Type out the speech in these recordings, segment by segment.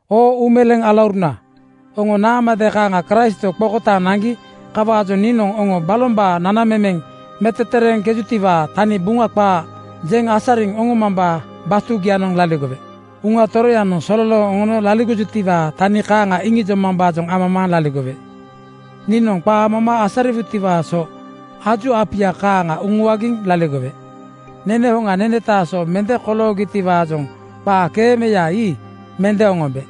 Oo uumeleeŋ alauruna, oŋo naamade kaaŋa Kraistwo qokotaaŋ naŋgi. Kawaajoŋ niinoŋ oŋo balombaa nanamemeŋ metetereeŋkejutiwaa tani Buŋa qaa jeŋ asariŋ oŋoma batugianoŋ laligowe. Uŋa Toroyanoŋ sololooŋ oŋono laligojutiwaa tani kaaŋa iŋijomambaajoŋ amamaaŋ laligowe. Niinoŋ qaa moma asariwutiwaa so aju apuya kaaŋa uŋuagiŋ laligowe. Nene hoŋa nenetaa so mende koloogitiwaajoŋ qaakeemeyaii mende oŋombe.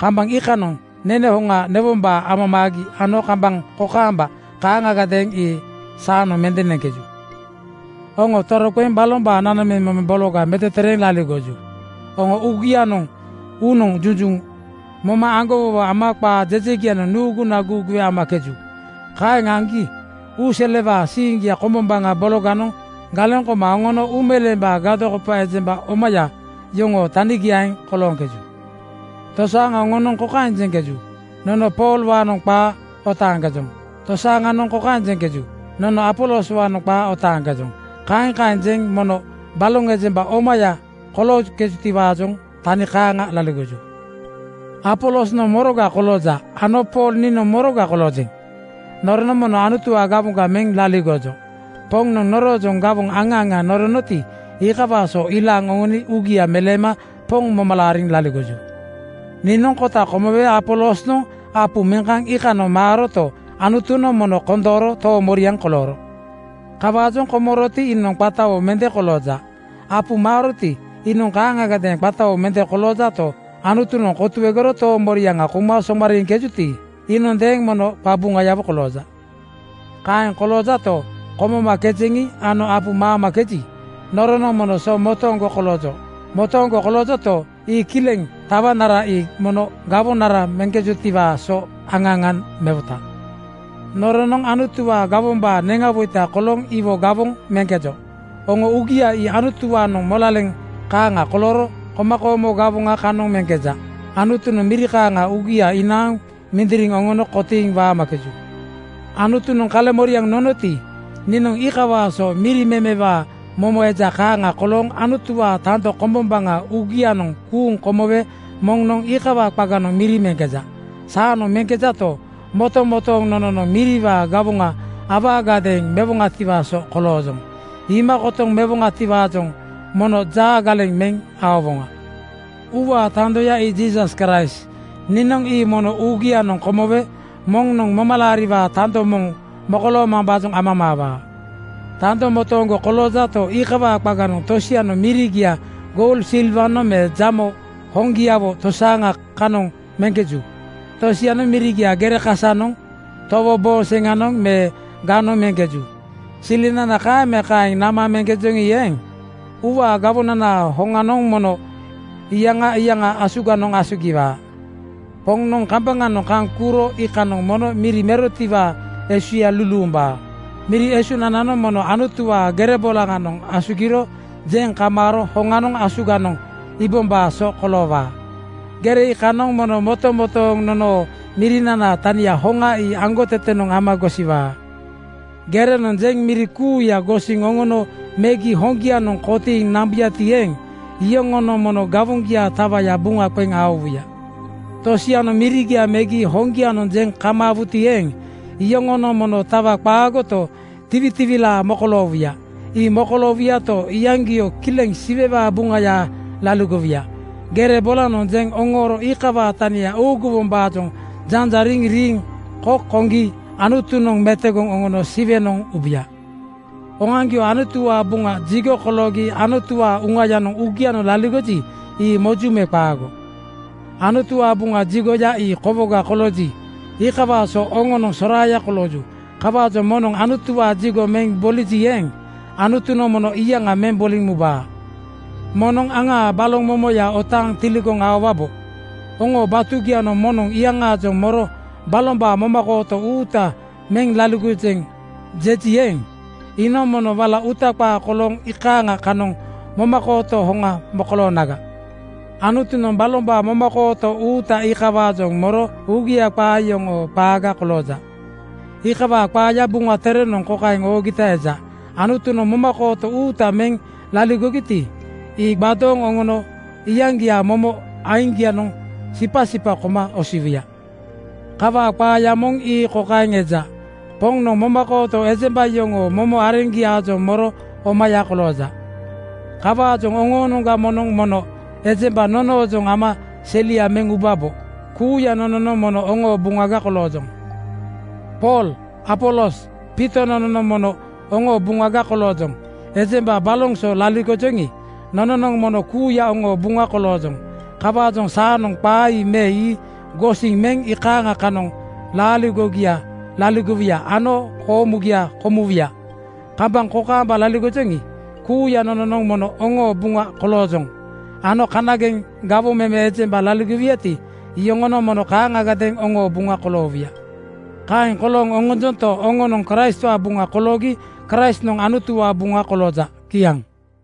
Kambaŋ iikanoŋ nene hoŋa newombaa amamaagi ano kambaŋ kokaamba kaaŋagadeeŋ ii saanoŋ mende neŋkeju. Oŋo toroqeŋ balombaa nanamemeŋ bologa metetereeŋ laligoju. Oŋo uugianoŋ uunoŋ junjuŋ moma aŋgowowo ama qaa jejegianoŋ nuuguna guuguwe amakeju. Kaeŋ aŋgi uu selewaa siiŋgia kombombaŋa bologanoŋ galeŋ koma oŋono uumeleembaa gadokopa ejemba omaya yoŋoo tanigiaeŋ kolooŋkeju. Tosaaŋa oŋonoŋ kokaeŋ jeŋkeju, “Nono Poolwaanoŋ qaa otaaŋkejoŋ.” Tosianoŋ kokaeŋ jeŋkeju, “Nono Apoloswaanoŋ qaa otaaŋkejoŋ.” Kaeŋ kaeŋ jeŋ mono baloŋ ejemba omaya kolooŋkejutiwaa tani kaaŋa laligoju. Apolosnoŋ moroga kolooja ano Pool niinoŋ moroga koloojeŋ? Noronoŋ mono Anutuwaa gawoŋga meŋ laligojo. Poŋnoŋ noroojoŋ gawoŋ aŋa aŋa noronoti, iikawaa so ilaaŋ oŋoni uugia meleema Poŋ moma laariŋ laligoju. Niinoŋ kota komowe Apolosnoŋ apu meŋ kaŋ iikanoŋ maaroto, Anutunoŋ mono kondooro toomoriaŋ kolooro. Kawaajoŋ komoroti, iinoŋ qatawo mende kolooja. Apu maaroti, iinoŋ kaaŋagadeeŋ qatawo mende koloojato, Anutunoŋ kotuegoro toomoriaŋa kouma somariiŋkejuti, iinondeeŋ mono qabuŋayawo kolooja. Kaeŋ koloojato, komomakejeŋi ano apu maamakeji, noronoŋ mono so motooŋgo koloojo. Motooŋgo koloojoto, ii kileŋ tawanara ii mono gawonara meŋkejotiwaa so aŋa aŋa mewota. Noronoŋ Anutuwaa gawombaa neŋawoita kolooŋ iwo gawoŋ meŋkejo. Oŋoo uugia ii Anutuwaanoŋ molaleŋ kaaŋa kolooro komakoomo gawoŋa kanoŋ meŋkeja. Anutunoŋ miri kaaŋa uugia inaaŋ mindiriŋ oŋono kotiiŋ waamakeju. Anutunoŋ kaleŋmoriaŋ nonoti, niinoŋ iikawaa so miri memewaa momo eja kaaŋa kolooŋ Anutuwaa tando kombombaŋa uugianoŋ kuuŋ komowe moŋnoŋ iikawaa qaganoŋ miri meŋkeja. Saanoŋ meŋkejato, motomotooŋ nononoŋ miriwaa gawoŋa awaagadeeŋ mewoŋatiwaa so koloojoŋ. Iima kotoŋ mewoŋatiwaajoŋ mono jaa galeŋ meŋ aowoŋa. Uuwaa tandoya ii Jiisas Kraist. Niinoŋ ii mono uugianoŋ komowe moŋnoŋ momalaariwaa tando moŋ mokoloomambaajoŋ amamaawaa. Tando motooŋgo koloojato, iikawaa qaganoŋ tosianoŋ mirigia goul silwanoŋ me jamo hoŋgiawo tosaaŋa kanoŋ meŋkeju. Tosianoŋ mirigia gere kasanoŋ, towo booŋ seŋanoŋ me ganoŋ meŋkeju. Silinana kaeŋ me kaeŋ nama meŋkejoŋi eeŋ, uuwaa gawonanaa hoŋanoŋ mono iyaŋa iyaŋa asuganoŋ asugiwaa. Poŋnoŋ kambaŋanoŋ kaŋ kuuro iikanoŋ mono miri merotiwaa esuya luluumbaa. Miri esunananoŋ mono Anutuwaa gere bolaŋanoŋ asugiro jeŋ kamaaro hoŋanoŋ asuganoŋ iibombaa so koloowaa. Gere iikanoŋ mono motomotooŋ nonoo mirinanaa tania hoŋa ii aŋgotetenoŋ ama gosiwaa. Gerenoŋ jeŋ miri kuuya gosiŋ oŋono megi hoŋgianoŋ kotiiŋ nambuyati eeŋ, iyoŋonoŋ mono gawoŋgiaa tawaya buŋa qeŋ aowuya. Tosianoŋ mirigia megi hoŋgianoŋ jeŋ kamaawuti eeŋ, iyoŋonoŋ mono tawa qaagoto, tiwitiwilaa mokoloowuya. Ii mokoloowuyato, iyaŋgio kileŋ Siwewaa buŋaya laligowuya. Gere bolanoŋ jeŋ oŋooro iikawaa tani uuguwombaajoŋ janjariŋ riiŋ kok koŋgi Anutunoŋ metogoŋ oŋono Siwenoŋ ubuya. Oŋoaŋgio Anutuwaa Buŋa jigo (tempel) koloogi Anutuwaa Uŋayanoŋ uugianoŋ laligoji, ii moju me qaago? Anutuwaa Buŋa jigoya ii kowoga kolooji, iikawaa so oŋonoŋ soraaya kolooju. Kawaajoŋ moŋnoŋ Anutuwaa jigo meŋ boliji eeŋ, Anutunoŋ mono iyaŋa meŋ boliŋ mubaa. Moŋnoŋ aŋaa baloŋ momoya otaaŋ tiligoŋ aowabo. Oŋoo batugianoŋ moŋnoŋ iyaŋaajoŋ moro “Balombaa momakooto uuta meŋ laligojeŋ,” jeji eeŋ, iinoŋ mono wala uuta qaa kolooŋ iikaaŋa kanoŋ momakooto hoŋa mokoloonaga. Anutunoŋ balombaa momakooto uuta iikawaajoŋ moro uugia qaa yoŋoo qaaga kolooja. Iikawaa qaaya Buŋa Terenoŋ kokaeŋ oogita eja, “Anutunoŋ momakooto uuta meŋ laligojuti, ii gbadooŋ oŋono iyaŋgiaa momo aiŋgianoŋ sipasipa koma osiwuya.” Kawaa qaaya moŋ ii kokaeŋ eja, “Poŋnoŋ momakooto ejemba yoŋoo momo areŋgiaajoŋ moro omaya kolooja.” Kawaajoŋ oŋoonoŋga moŋnoŋ mono ejemba nonoojoŋ ama selia meŋ ubabo. Kuuya nononoŋ mono oŋoo buŋaga koloojoŋ. Pool, Apolos, Piito nononoŋ mono oŋoo buŋaga koloojoŋ. Ejemba baloŋ so laligojoŋi, nononoŋ mono kuuya oŋoo buŋa koloojoŋ. Kawaajoŋ saanoŋ qaa ii me ii gosiŋ meŋ iikaaŋa kanoŋ laaligogia laligowuya ano koomugia komuwuya. Kambaŋ kokaamba laligojoŋi, kuuya nononoŋ mono oŋoo buŋa koloojoŋ ano kanageŋ gawoŋ meme ejemba laligowuyati, iyoŋonoŋ mono kaaŋagadeeŋ oŋoo buŋa koloowuya. Kaeŋ kolooŋ oŋonjonto, oŋonoŋ Kraistwaa buŋa koloogi Kraistnoŋ Anutuwaa buŋa kolooja. Kiaŋ.